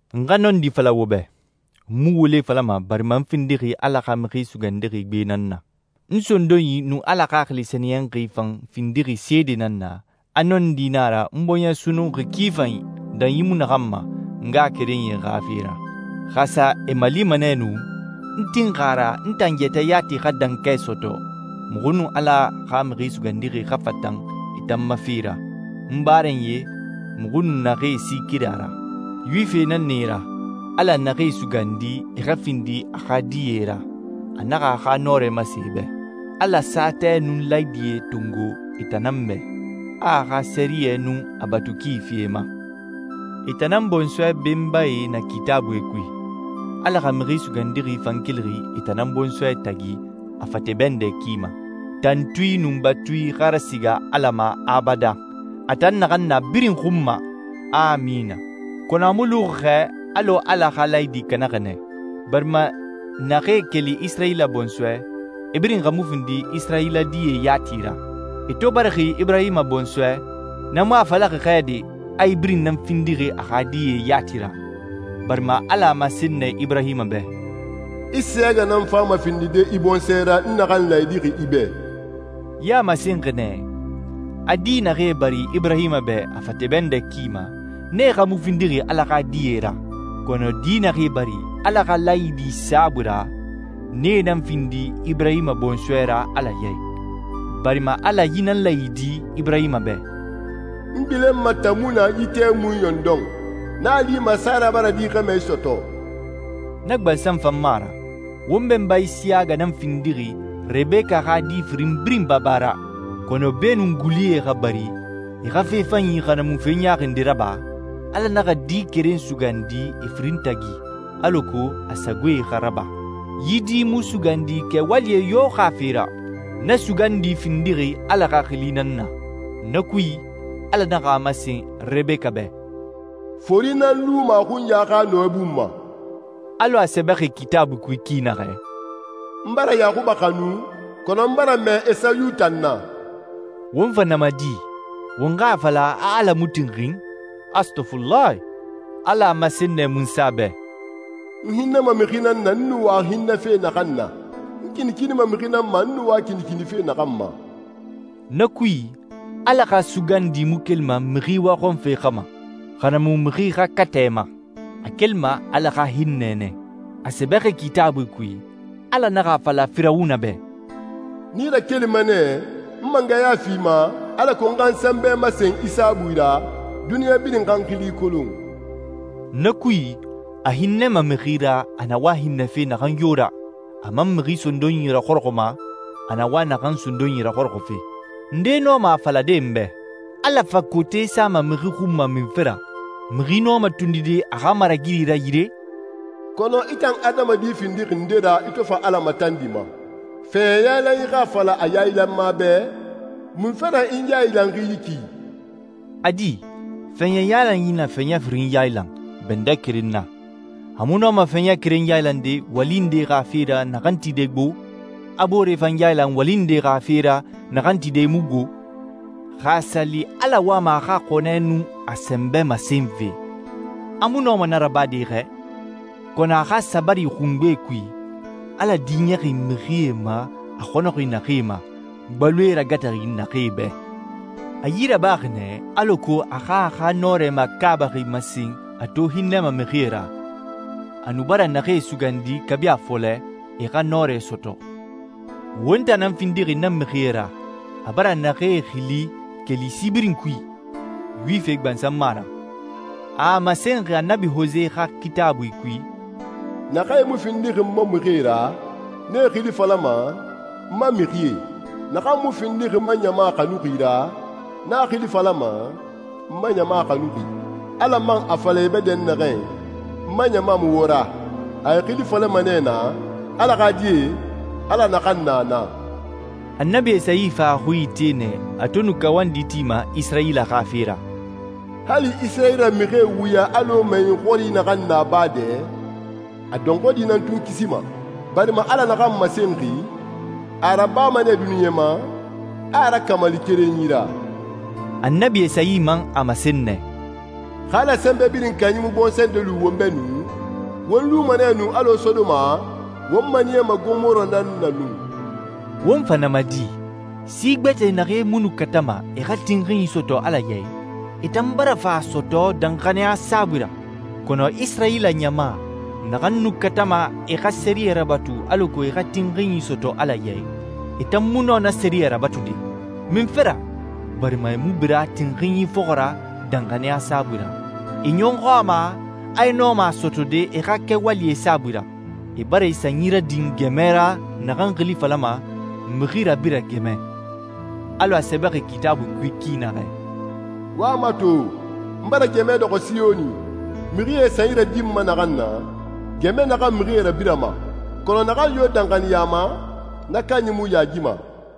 N xa nɔndi fala wo bɛ. N mu wule falama barima n findixi Ala xa Mixi Sugandixi gbe nan na. N sondonyi nun Ala Xaxili Sɛniyɛnxi fan findixi seedee nan na, a nɔndi nan a ra n bɔɲɛ sunnunxi ki fanyi, danyi mu naxan ma, n ngaxakerenyie xa fe ra. Xa a sa e malima nɛ nu, n tinxi a ra n tan yɛtɛ yati xa dankɛ sɔtɔ, muxu nun Ala xa Mixi Sugandixi xa fatan e tan ma fe ra, n barenyie muxu nun naxee si keren a ra. Yuwifie nan na e ra, Ala naxee sugandi e xa findi a xa die ra, a naxa a xa nɔrɛ masen e bɛ. Ala saatɛe nun laayidie tongo e tan nan bɛ, a a xa sɛriyɛ nun a batu ki fi e ma. E tan nan bɔnsɔɛ benbae na Kitaabuie kui, Ala xa Mixi Sugandixi fan kelixi e tan nan bɔnsɔɛ tagi a fate bɛndɛ ki ma. Tantui nun batui xa rasiga Ala ma abadan, a tan naxan na birin xun ma. Amina. Kɔnɔ a mu luxi xɛ alɔ Ala xa laayidi kanaxi nɛ. Barima naxee keli Isirayila bɔnsɔɛ, e birin xa mu findi Isirayila die yati ra. E to barixi Iburahima bɔnsɔɛ, na mu a falaxi xɛ de a e birin nan findixi a xa die yati ra, barima Ala a masen nɛ Iburahima bɛ, «Isiyaga nan fama findide i bɔnsɔɛ ra n naxan laayidi i bɛ.» Yi a masenxi nɛ, a di naxee bari Iburahima bɛ a fate bɛndɛ ki ma, nee xa mu findixi Ala xa die ra. Kɔnɔ di naxee bari Ala xa laayidi saabui ra, nee nan findi Iburahima bɔnsɔɛ ra Ala ya i. Barima Ala yi nan laayidi Iburahima bɛ, «N gbilenma tamuna yi tɛmui ɲɔndɔn, n a lima Sara bara di xɛmɛ sɔtɔ.» Na gbansan fan mu a ra. Won benba Isiyaga nan findixi Rebeka xa di firin birin baba ra. Kɔnɔ beenun gulie xa bari e xa fe fanyi xa na mu fe ɲaaxi nde raba, Ala naxa di keren sugandi e firin tagi alako a sagoe xa raba. Yi di mu sugandi kɛwalie yo xa fe ra. Na sugandi findixi Ala xa xili nan na. Na kui, Ala naxa a masen Rebeka bɛ, «Fori nan luma a xunya xa nɔɛ bun ma.» Alɔ a sɛbɛxi Kitaabui kui ki naxɛ, «N bara Yaxuba xanu, kɔnɔ n bara mɛɛ Esayu tan na.» Won fa na ma di? Won xa a fala a Ala mu tinxin? Astɔfulahi! Ala a masen nɛ Munsa bɛ, «N hinnɛma mixi nan na n na wa hinnɛfe naxan na. N kinikinima mixi nan ma n na wa kinikinife naxan ma.» Na kui, Ala xa sugandi mu kelima mixi waxɔnfe xa ma, xa na mu mixi xa katɛ ma. A kelima Ala xa hinnɛ nɛ. A sɛbɛxi Kitaabui kui, Ala naxa a fala Firawuna bɛ, «N i rakelixi nɛ, n mangɛya fi i ma, alako n xa n sɛnbɛ masen i saabui ra, duniɲa birin xa n xili kolon.» Na kui, a hinnɛma mixi ra a na wa hinnɛfe naxan yo ra, a man mixi sondonyi raxɔrɔxɔma a na wa naxan sondonyi raxɔrɔxɔfe. Nde nɔma a falade n bɛ, «Ala fa kote sama mixi xun ma munfe ra? Mixi nɔma tondide a xa maragiri ra yire?» Kɔnɔ i tan adamadi findixi nde ra i to fa Ala matandima? Fɛɲɛ yailanxi xa a fala a yailanma bɛ, «Munfe ra i n yailanxi yi ki?» A di, fɛɲɛ yailanyi na fɛɲɛ firin yailan bɛndɛ keren na, a mu nɔma fɛɲɛ keren yailande wali nde xa fe ra naxan tide gbo, a boore fan yailan wali nde xa fe ra naxan tide mu gbo? Xa a sa li Ala wama a xa xɔnɛ nun a sɛnbɛ masenfe, a mu nɔma na rabade xɛ? Kɔnɔ a xa sabari xungbe kui, Ala diɲɛxi mixie ma a xɔnɔxi naxee ma, gbaloe ragataxi naxee bɛ. A yi rabaxi nɛ alako a xa a xa nɔrɛ makaabaxi masen a to hinnɛma mixie ra, a nu bara naxee sugandi kabi a fɔlɛ, e xa nɔrɛ sɔtɔ. Won tan nan findixi na mixie ra a bara naxee xili keli si birin kui. Yuwifie gbansan mu a ra. A a masenxi Annabi Hose xa Kitaabui kui, «Naxee mu findixi n ma mixie ra, n e xili falama ‹n ma mixie.› Naxan mu findixi n ma ɲama xanuxi ra, n a xili falama ‹n ma ɲama xanuxi.›» «Ala man a fala e bɛ dɛnnaxɛ, ‹N ma ɲama mu wo ra,› a e xili falama nɛ naa, ‹Ala xa die, Ala naxan na na.›» Annabi Esayi fan a xui ite nɛ a to nu kawandi tima Isirayila xa fe ra, «Hali Isirayila mixie wuya alɔ mɛyɛn xɔri naxan na baa dɛ, a dɔnxɔɛ di nan tun kisima, barima Ala naxan masenxi, a a rabama nɛ duniɲa ma, a a rakamali kerenyi ra.» Annabi Esayi man a masen nɛ, «Xa Ala Sɛnbɛ Birin Kanyi mu bɔnsɔɛ nde lu won bɛ nu, won luma nɛ nu alɔ Sodoma, won maniyama Gomora nan na nu.» Won fa na ma di? Si gbɛtɛ naxee mu nu katama e xa tinxinyi sɔtɔ Ala ya i, e tan bara fa a sɔtɔ danxaniya saabui ra, kɔnɔ Isirayila ɲama naxan nu katama e xa sɛriyɛ rabatu alako e xa tinxinyi sɔtɔ Ala ya i, e tan mu nɔ na sɛriyɛ rabatude. Munfe ra? Barima e mu bira tinxinyi fɔxɔ ra danxaniya saabui ra, e ɲɔxɔ a ma a e nɔma a sɔtɔde e xa kɛwalie saabui ra. E bara e sanyi radin gɛmɛ ra naxan xili falama, «mixi rabira gɛmɛ». Alɔ a sɛbɛxi Kitaabui kui ki naxɛ, «Wo a mato, n bara gɛmɛ dɔxɔ Siyoni, mixie e san nadinma naxan na, gɛmɛ naxan mixie rabirama. Kɔnɔ naxan yo danxaniya a ma, na kanyi mu yaagima.»